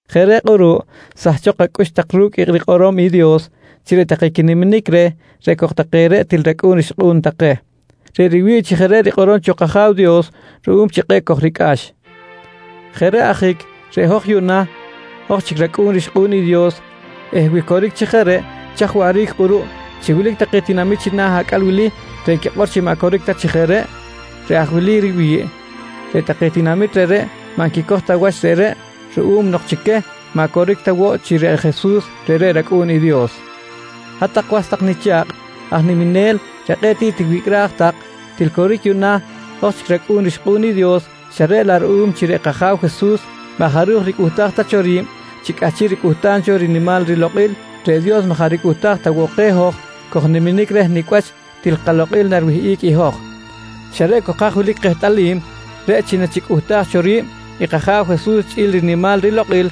Jeꞌ reꞌ kꞌuruꞌ, sahchok aj kacꞌux ru̱cꞌ i rikꞌorom i Dios chi reꞌ take quiniminic reh reꞌ cok take reꞌ til racꞌu̱n rixkꞌu̱n take. Reꞌ riwi̱ꞌ chi jeꞌ reꞌ rikꞌorom cho kAja̱w Dios ruꞌum chi kꞌe̱ꞌ kojricꞌax. Jeꞌ reꞌ ajic reꞌ hoj yuꞌna, hoj chic racꞌu̱n rixkꞌu̱n i Dios eh wi coric chi jeꞌ reꞌ, chaj waꞌric kꞌuruꞌ chi wilic take tinamit china̱ acꞌal wili reꞌ nquikꞌor chi maꞌ coric ta chi jeꞌ reꞌ? Reꞌ aj wili riwi̱ꞌ: Reꞌ take tinamit reꞌreꞌ maꞌ nquicoj ta wach reꞌreꞌ ruꞌum nok chi queh maꞌ coric ta woꞌ chi reꞌ Jesus reꞌreꞌ i rAcꞌu̱n i Dios. Hat-tak was tak nicha̱kꞌ aj niminel reꞌ kꞌe̱ꞌ tiꞌ tiwicꞌraj tak, til coric yuꞌna hoj chic racꞌu̱n rixkꞌu̱n i Dios xa reꞌ laꞌ ruꞌum chi reꞌ kAja̱w Jesus maꞌ jaꞌ ricꞌuhtaj ta cho ri̱b chi cꞌahchiꞌ ricꞌuhtam cho rinimal rilokꞌil, reꞌ Dios maꞌ jaꞌ ricꞌuhtaj ta woꞌ keh hoj kojniminic reh nicꞌ wach til kalokꞌil nariwihꞌic i hoj. Xa reꞌ cok haj wilic kehtꞌalim reꞌ chi nachicꞌuhtaj cho ri̱b i kAja̱w Jesus chꞌi̱l rinimal rilokꞌil,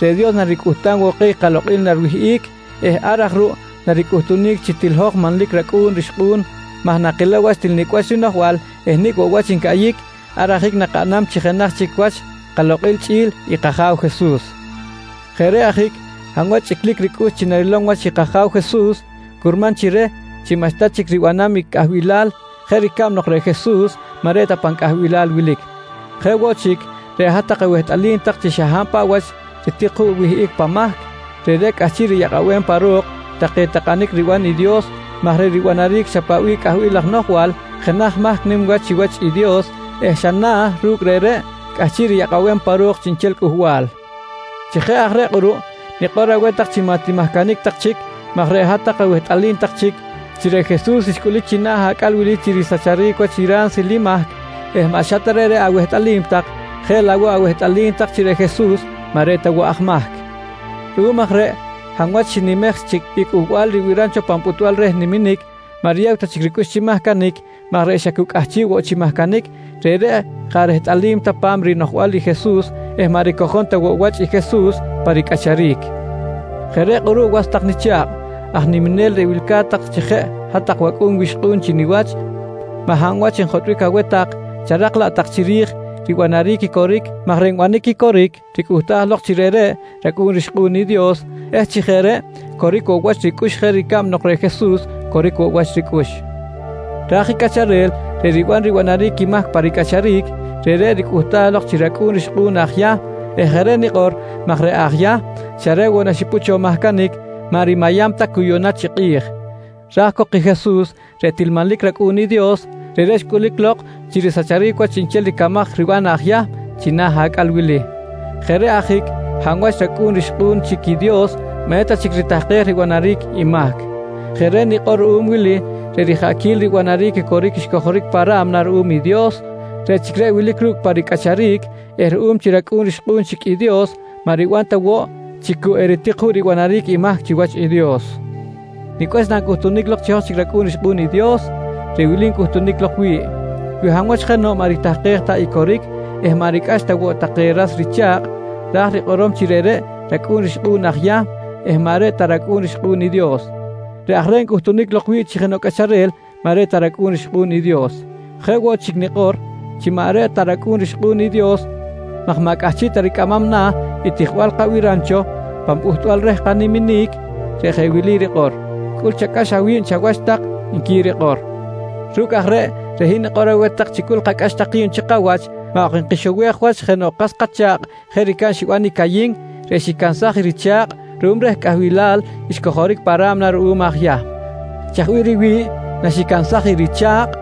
reꞌ Dios naricꞌuhtam woꞌ keh i kalokꞌil nariwihꞌic eh ar aj ruꞌ naricꞌuhtunic chi til hoj manlic racꞌu̱n rixkꞌu̱n maj nakilow wach til nicꞌ wach rinoꞌjbal eh nicꞌ woꞌ wach ncaꞌyic, ar ajic nakaꞌnam chi jenaj chic wach kalokꞌil chꞌi̱l i kAja̱w Jesus. Jeꞌ reꞌ ajic hab wach chꞌiclic ricꞌux chi narilom wach i kAja̱w Jesus curman chi reh chi maꞌxta chic ribanam i cꞌahbilal jeꞌ ricab nok reꞌ Jesus maꞌ reꞌ ta pan cꞌahbilal wilic. Jeꞌ woꞌ chic, reꞌ hat-tak awehtꞌalim tak chi xa hab paꞌ wach ritik juꞌ wihꞌic pan mahc, reꞌreꞌ cꞌahchiꞌ riyakꞌabem pa ro̱k take takꞌanic riban i Dios maj reꞌ ribanaric xa paꞌ bih cꞌahbil laj noꞌjbal jenaj mahc nim wach chiwach i Dios eh xa na̱ ruꞌ ru̱cꞌ reꞌreꞌ cꞌahchiꞌ riyakꞌabem pa ro̱k chiꞌnchel cꞌuhbal. Chi jeꞌ aj reꞌ kꞌuruꞌ, nikꞌor aweh tak chi maꞌ timahcanic tak chic maj reꞌ hat-tak awehtꞌalim tak chic chi reꞌ Jesus xcꞌulic china̱ acꞌal wili chi risacharic wach i ransil i mahc eh maꞌ xa ta reꞌreꞌ awehtꞌalim tak, jeꞌ laꞌ woꞌ awehtꞌalim tak chi reꞌ Jesus maꞌ reꞌ ta woꞌ aj mahc. Ruꞌum aj reꞌ hab wach xinimej chic i cꞌuhbal ribiram cho pan pꞌutbal reh riniminic, maꞌ riyew ta chic ricꞌux chi mahcanic maj reꞌ xa cu cꞌahchiꞌ woꞌ chi mahcanic, reꞌreꞌ jaꞌ rehtꞌalim ta pa̱m i rinoꞌjbal i Jesus eh maꞌ ricojom ta woꞌ wach i Jesus pa ricꞌacharic. Jeꞌ reꞌ kꞌuruꞌ was tak nicha̱kꞌ aj niminel reꞌ wilca̱t tak chi jeꞌ hat-tak wacꞌu̱n wixkꞌu̱n chi niwach, maꞌ hab wach njotꞌbic aweh tak, charak laꞌ tak chiri̱j ribanaric i coric maj reꞌ nbanic i coric ricꞌuhtaj lok chi reꞌreꞌ racꞌu̱n rixkꞌu̱n i Dios eh chi jeꞌ reꞌ coric woꞌ wach ricꞌux jeꞌ ricab nok reꞌ Jesus coric wach ricꞌux. Raj i cꞌacharel reꞌ riban ribanaric i mahc pa ricꞌacharic, reꞌreꞌ ricꞌuhtaj lok chi racꞌu̱n rixkꞌu̱n aj Yahm eh jeꞌ reꞌ nikꞌor maj reꞌ aj Yahm xa reꞌ woꞌ naxipꞌut cho mahcanic, maꞌ rimayam ta cu yuꞌna chi kꞌi̱j. Raj cok i Jesus reꞌ til manlic rAcꞌu̱n i Dios, reꞌreꞌ xcꞌulic lok chi risacharic wach chiꞌnchel ricamaj riban aj Yahm china̱ acꞌal wili. Jeꞌ reꞌ ajic hab wach racꞌu̱n rixkꞌu̱n chic i Dios maꞌ eta chic ritahkej ribanaric i mahc. Jeꞌ reꞌ nikꞌor ruꞌum i wili: Reꞌ rijaꞌquil ribanaric i coric xcojoric pa ra̱mna ruꞌum i Dios, reꞌ chic reꞌ wilic ru̱cꞌ pa ricꞌacharic eh ruꞌum chi racꞌu̱n rixkꞌu̱n chic i Dios, maꞌ riban ta woꞌ chi cu eritik juꞌ ribanaric i mahc chiwach i Dios. Nicꞌ wach nancꞌuhtunic lok chi hoj chic racꞌu̱n rixkꞌu̱n i Dios? Reꞌ wili ncꞌuhtunic lok wi̱ꞌ: Wi hab wach jenoꞌ maꞌ ritahkej ta i coric eh maꞌ ricꞌax ta woꞌ take ras richa̱kꞌ ra̱j rikꞌorom chi reꞌreꞌ racꞌu̱n rixkꞌu̱n aj Yahm eh maꞌ reꞌ ta racꞌu̱n rixkꞌu̱n i Dios. Reꞌ aj reꞌ ncꞌutunic lok wi̱ꞌ chi jenoꞌ cꞌacharel maꞌ reꞌ ta racꞌu̱n rixkꞌu̱n i Dios. Jeꞌ woꞌ chic nikꞌor chi maꞌ reꞌ ta racꞌu̱n rixkꞌu̱n i Dios maj maꞌ cꞌahchiꞌ ta ricꞌamam na̱ i tijbal kabiram cho pan pꞌuhtbal reh kaniminic reꞌ jeꞌ wili rikꞌor: «Cꞌul chacꞌax awi̱b chawach tak, nqui rikꞌor. Ru̱cꞌ aj reꞌ, reꞌ hin nikꞌor aweh tak chi cꞌul kacꞌax tak ki̱b chi kawach maꞌ ok nkixowej wach jenoꞌ kas kacha̱kꞌ jeꞌ ricab xiban i Cayin reꞌ xicansaj i richa̱kꞌ ruꞌum reh cꞌahbilal xcojoric pa ra̱mna ruꞌum aj Yahm. Chaj bih riwi̱ꞌ naxicansaj i richa̱kꞌ?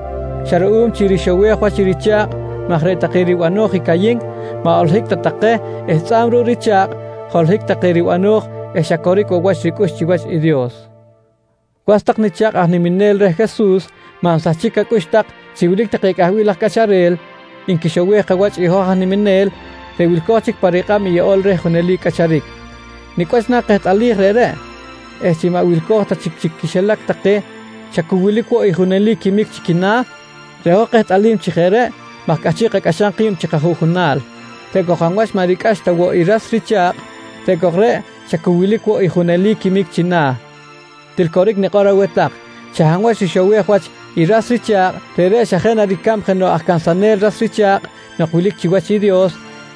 Xa ruꞌum chi rixowej wach i richa̱kꞌ maj reꞌ take ribano̱j i Cayin maꞌ holohic ta take eh tzꞌa̱b ruꞌ i richa̱kꞌ, holohic take ribano̱j eh xa coric woꞌ wach ricꞌux chiwach i Dios. Was tak nicha̱kꞌ aj niminel reh Jesus, maꞌ nsahchic acꞌux tak chi wilic take cꞌahbil laj cꞌacharel nquixowej kawach i hoj aj niminel reꞌ wilco̱j chic pa rikꞌab i Yeꞌol reh Junelic Cꞌacharic. Nicꞌ wach na kehtꞌalij reꞌreꞌ eh chi maꞌ wilco̱j ta chic chi quixilac take xa cu wilic woꞌ i junelic quimic chi quina̱? Reꞌ hoj nkehtꞌalij chi jeꞌ reꞌ maj cꞌahchiꞌ kacꞌaxam ki̱b chi kajuꞌjunal, reꞌ cok hab wach maꞌ ricꞌax ta woꞌ i ras richa̱kꞌ reꞌ cok reꞌ xa cu wilic woꞌ i junelic quimic china̱. Til coric nikꞌor aweh tak xa hab wach rixowej wach i ras richa̱kꞌ, reꞌreꞌ xa jeꞌ na ricab jenoꞌ aj cansanel ras richa̱kꞌ nok wilic chiwach i Dios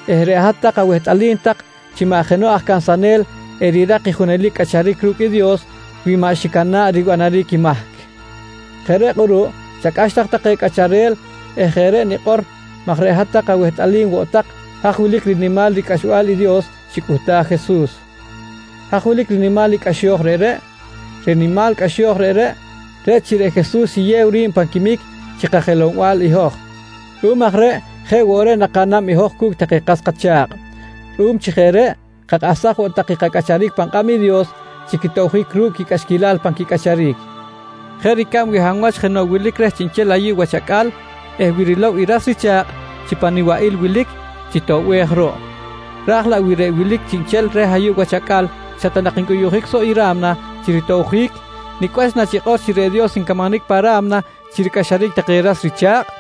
eh reꞌ hat-tak awehtꞌalim tak chi maꞌ jenoꞌ aj cansanel erirak i junelic cꞌacharic ru̱cꞌ i Dios wi maꞌ xicana̱ꞌ ribanaric i mahc. Jeꞌ reꞌ kꞌuruꞌ chacꞌax tak take cꞌacharel eh jeꞌ reꞌ nikꞌor maj reꞌ hat-tak awehtꞌalim woꞌ tak haj wilic rinimal ricꞌaxbal i Dios xicꞌuhtaj i Jesus. Haj wilic rinimal i cꞌaxo̱j reꞌreꞌ? Reꞌ rinimal cꞌaxo̱j reꞌreꞌ, reꞌ chi reꞌ Jesus xiyew ri̱b pan quimic chi kajelow-bal i hoj. Ruꞌum aj reꞌ jeꞌ woꞌ reꞌ nakaꞌnam i hoj cu̱cꞌ take kas kacha̱kꞌ. Ruꞌum chi jeꞌ reꞌ, kakꞌahsaj woꞌ tak i kacꞌacharic pan kꞌab i Dios chi quitobjic ru̱cꞌ quicꞌaxquilal pan quicꞌacharic. Jeꞌ ricab wi hab wach jenoꞌ wilic chiꞌnchel reh ayuꞌ wach acꞌal eh wi rilow i ras richa̱kꞌ chi pan nibaꞌil wilic chitoꞌbej ruꞌ. Raj laꞌ wi reꞌ wilic chiꞌnchel reh ayuꞌ wach acꞌal xa ta nak ncꞌuyuꞌjic soꞌ i ra̱mna chi ritobjic, nicꞌ wach nachikꞌor chi reꞌ Dios ncamanic pa ra̱mna chi ricꞌaxaric take ras richa̱kꞌ?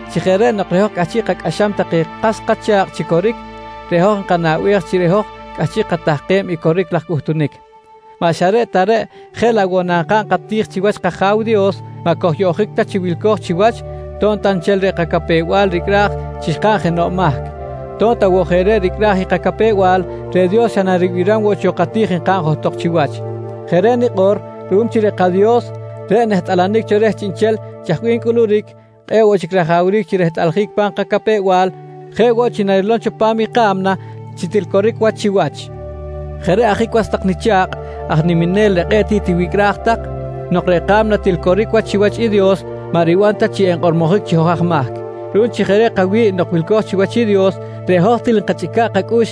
Chi jeꞌ reꞌ nok reꞌ hoj cꞌahchiꞌ kacꞌaxam take kas kacha̱kꞌ chi coric reꞌ hoj enkanaꞌbej chi reꞌ hoj cꞌahchiꞌ katahkem i coric laj cꞌuhtunic. Maꞌ xa reꞌ ta reꞌ, jeꞌ laꞌ woꞌ nankaꞌn kati̱j chiwach kAja̱w Dios, maꞌ kojyoꞌjic ta chi wilco̱j chiwach to̱b ta nchel reꞌ kacapew-bal ricꞌraj chi xkaꞌn jenoꞌ mahc. To̱b ta woꞌ jeꞌ reꞌ ricꞌraj i kacapew-bal, reꞌ Dios xa naribiram woꞌ cho kati̱j nkaꞌn johtok chiwach. Jeꞌ reꞌ nikꞌor ruꞌum chi reꞌ kaDios reꞌ nehtꞌalanic cho reh chiꞌnchel chaj bih ncꞌuluric, kꞌe̱ꞌ woꞌ chic rajawric chi rehtꞌaljic pa̱m kacapew-bal jeꞌ woꞌ chi narilom cho pa̱m i ka̱mna chi til coric wach chiwach. Jeꞌ reꞌ ajic was tak nicha̱kꞌ aj niminel reꞌ kꞌe̱ꞌ tiꞌ tiwicꞌraj tak, nok reꞌ ka̱mna til coric wach chiwach i Dios maꞌ riban ta chi enkꞌormojic chi hoj aj mahc. Ruꞌum chi jeꞌ reꞌ kawi̱ꞌ nok wilco̱j chiwach i Dios reꞌ hoj til nkachꞌica̱ꞌ kacꞌux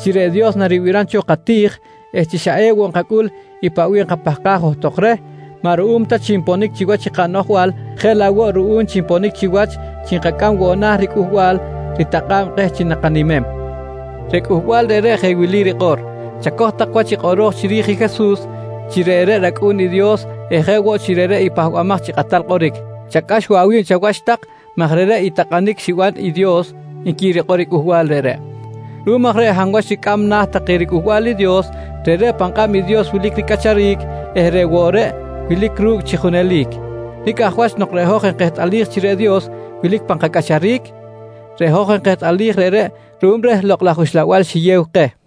chi reꞌ Dios naribiram cho kati̱j eh chi xa ewoꞌ nkacꞌul i paꞌ bih enkapahkaj johtok reh maꞌ ruꞌum ta chi nponic chiwach i kanoꞌjbal jeꞌ laꞌ woꞌ ruꞌum chi nponic chiwach chi nkacꞌam woꞌ na̱ riCꞌuhbal ritakꞌa̱b keh chi nakanimem. Reꞌ cꞌuhbal reꞌreꞌ jeꞌ wili rikꞌor: «Chacoj tak wach i kꞌoro̱j chiri̱j i Jesus chi reꞌreꞌ rAcꞌu̱n i Dios eh jeꞌ woꞌ chi reꞌreꞌ i Pahbamaj chi Kꞌatal Kꞌoric. Chacꞌax woꞌ awi̱b chawach tak maj reꞌreꞌ i takꞌanic xiban cho i Dios, nqui rikꞌor i cꞌuhbal reꞌreꞌ. Ruꞌum aj reꞌ hab wach ricꞌam na̱ take riCꞌuhbal i Dios, reꞌreꞌ pan kꞌab i Dios wilic ricꞌacharic eh reꞌ woꞌ reꞌ wilic ru̱cꞌ chi junelic. Nicꞌ aj wach nok reꞌ hoj enkehtꞌalij chi reꞌ Dios wilic pan kacꞌacharic? Reꞌ hoj enkehtꞌalij reꞌreꞌ ruꞌum reh Lokꞌ laj Uxlabal xiyew keh.